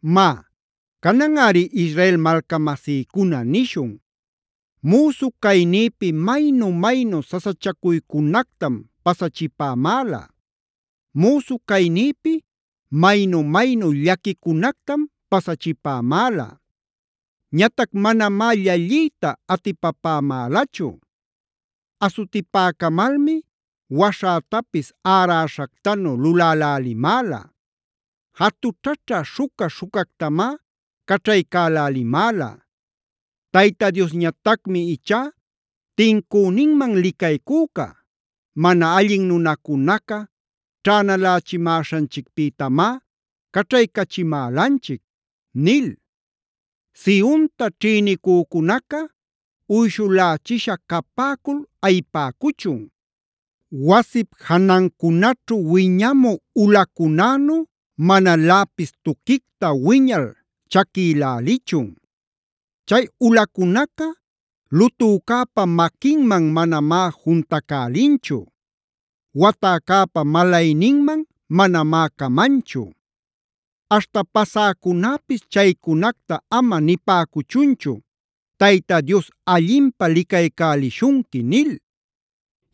Má, cananꞌari Israel malcamasïcuna nishun: “Müsu caynïpi maynu-maynu sasachacuycunactam pasachipämäla. Müsu caynïpi maynu-maynu llaquicunactam pasachipämäla. Ñatac manamá llalliyta atipapämälachu. Asutipäcamalmi waśhätapis äräśhactanu lulälälimäla. Jatućhaćha śhuca-śhucactamá caćhaycälälimäla. Tayta Diosñatacmi ichá tincüninman licaycüca. Mana allin nunacunaca ćhänalächimäśhanchicpïtamá caćhaycachimälanchic” nil. Sionta ćhïnicücunaca uyśhulächisha capäcul ayipäcuchun. Wasip janancunaćhu wiñamü ulacunänu manaläpis tuquicta wiñal chaquïlälichun. Chay ulacunaca lutücäpa maquinman manamá juntacälinchu. Watäcäpä malayninman manamá camanchu. Aśhta pasäcunäpis chaycunacta ama nipäcuchunchu: “Tayta Dios allinpä licaycälishunqui” nil.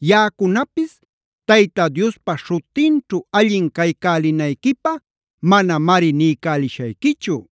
Yaꞌacunapis Tayta Diospa śhutinćhu allin caycälinayquipä manamari niycälishayquichu.